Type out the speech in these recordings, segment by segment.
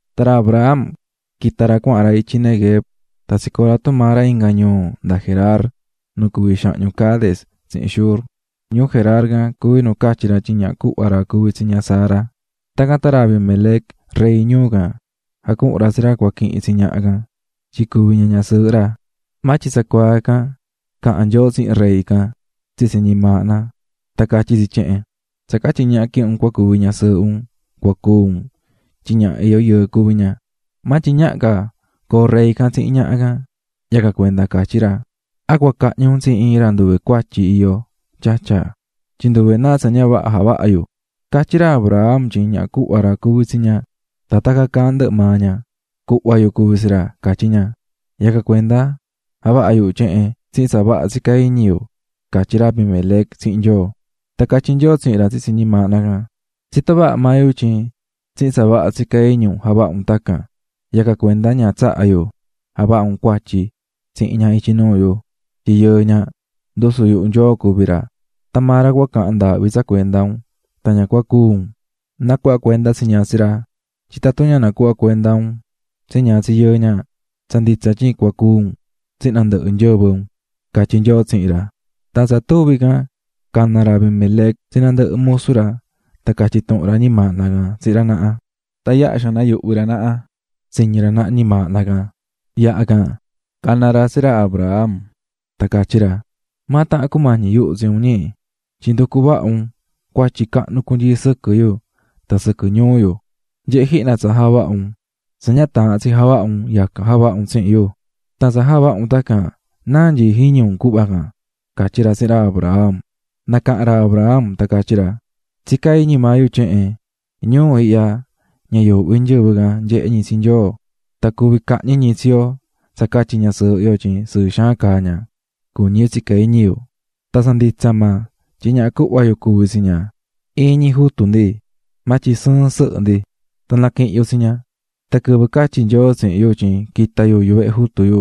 Tan ra Abraham quita̱ ra cuahan ra ityi Neguev tan tsicoo̱ ra tumaa ra inga ñuu nda Gerar nu cuví xahñu Cades tsihin Shur. Ñuu Gerar can cuví nu catyi̱ ra tyin ñaha cuhva ra cuví tsi ña Sara. Tacan tan ra Abimelec, rey ñuu can, jacuhu̱n ra tsi ra cua quihin tsi ñaha can, tyin cuvi ña ñasɨɨhɨ ra. Maa tyin tsacuaa ican caha̱n Nyoo tsihin rey can tsitsi ñimaahna tan catyí tsi tyehen: "Tsa catyi ñaha quihi̱n un cua cuvi ñasɨɨhɨ un cua cúu un tyin ñaha iyó yɨɨ cuví ña." Maa tyin ñaha ca coo rey can tsihin ñaha can, yacan cuenda catyí ra: "¿A cua cahñi un tsi iin ra nduve cuatyi iyó, Tyatya? Tyin nduve náa tsa ña vaha javaha̱ yu. Catyí ra Abraham tyin ñaha cuhva ra cuví tsi ña, tan tacan caahán ndɨhɨ maa ña: "Cuhva yu cuví tsi ra", catyí ña. Yacan cuenda javaha̱ yu tyehen tsihin tsa vaha tsicá iñi yu", catyí ra Abimelec tsihin Nyoo. Tan catyí Nyoo tsihin ra tsitsi ñimaahna can: "Tsitó vaha maa yu tyin tsihin tsa vaha tsicá iñi un javaha̱ un tacan, yacan cuenda ña tsaha̱ yu javaha un cuatyi tsihin ña ityi nuu yu. Tyin yɨɨ ña, ndusu yuhu Nyoo cuví ra, tan maa ra cua cahan ndaahvi tsa cuenda un tan ña cúu un. Na̱cuhva cuenda tsi ña tsi ra, tyin tatun ña nacuhva cuenda un tsi ña tsi yɨɨ ña, tsa nditsa tyin cua cúu un tsihin nandɨhɨ nyɨvɨ un", catyí Nyoo tsihin ra. Tan tsa tuvi can cana̱ ra Abimelec tsi nandɨhɨ musu ra tan catyi̱ tuhun ra ñimaahna can tsihin ra naha. Tan yaha xaan nayuhvi̱ ra naha tsiñi̱ ra naha ñimaahna can. Yaha can, cana̱ ra tsi ra Abraham tan catyí ra: --¿Maa tahan cumañi̱ yuhu tsi un, ñi?, tyin nducu̱ vaha un cuatyi cahnu cunyii sɨquɨ yu tan sɨquɨ ñuu yu. ¡Nye̱he jihna tsa javaha̱ un!, tsa ña taahán tsi javaha un, yacan javaha̱ un tsihin yu. Tan tsa javaha̱ un tacan, ¿náa tsicá iñi un cuhva can? --catyí ra tsihin ra Abraham. Nacaha̱n ra Abraham tan catyí ra: --Tsicá iñi maa yu tyehen: "Ñuu ihya ña yuuhvi nyɨvɨ nyehé ñi tsi Nyoo tan cuví cahñi ñi tsi yo tsa catyi ñasɨɨhɨ yo tyin sɨɨ xaan caá ña", cuñí yu tsicá iñi yu. Tan tsa nditsa maa, tyin ñaha cuhva yu cuví tsi ña. Iin ñi jutu ndi maa tyin sɨɨn sɨhɨ ndi, tan naquihi̱n yu tsi ña. Tan quɨvɨ catyi̱ Nyoo tsihin yu tyin quita yu yuvehe jutu yu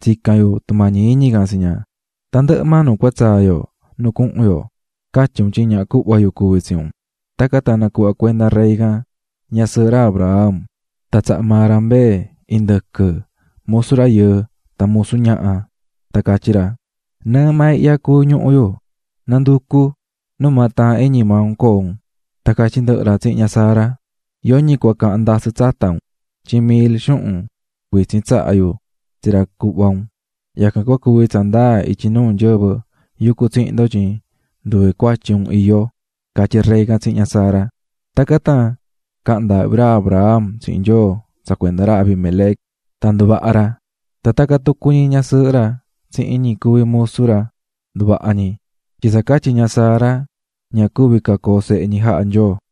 tsica̱n yu tumañi iñi can tsi ña: "Tandɨhɨ maa nu cua tsaa yo nu cuhun yo, ca̱tyi un tyin ñaha cuhva yu cuví tsi un." Tacan tan nacuhva̱ cuenda rey can ñasɨɨhɨ ra Abraham, tan tsaha̱ maa ra mbee, indɨquɨ, musu rayɨɨ tan musu ñaha. Tan catyí ra: --Nɨɨ maa ihya cuví ñuhu yu, na̱nducu numaa taahán iñi maa un coo un. Tan catyí ndɨhɨ ra tsihin ña Sara: --Yoñi cua cahan ndasɨ tsata un, tyin mil xuhun cuitsin tsaha̱ yu tsi ra cuhva un, yacan cua cuvi tsa ndaa ityi nuu nyɨvɨ yucú tsihin ndo tyin nduve cuatyi un iyó --catyí rey can tsihin ña Sara. Tacan tan caha̱n ndaahvi ra Abraham tsihin Nyoo tsa cuenda ra Abimelec tan nduvaha̱ ra, tan tacan tucu ñi ñasɨɨhɨ ra tsihin ñi cuví musu ra nduvaha̱ ñi, tyin tsa catyi ña Sara, ña cuvi̱ ca coo sehe ñi, jaha̱ Nyoo.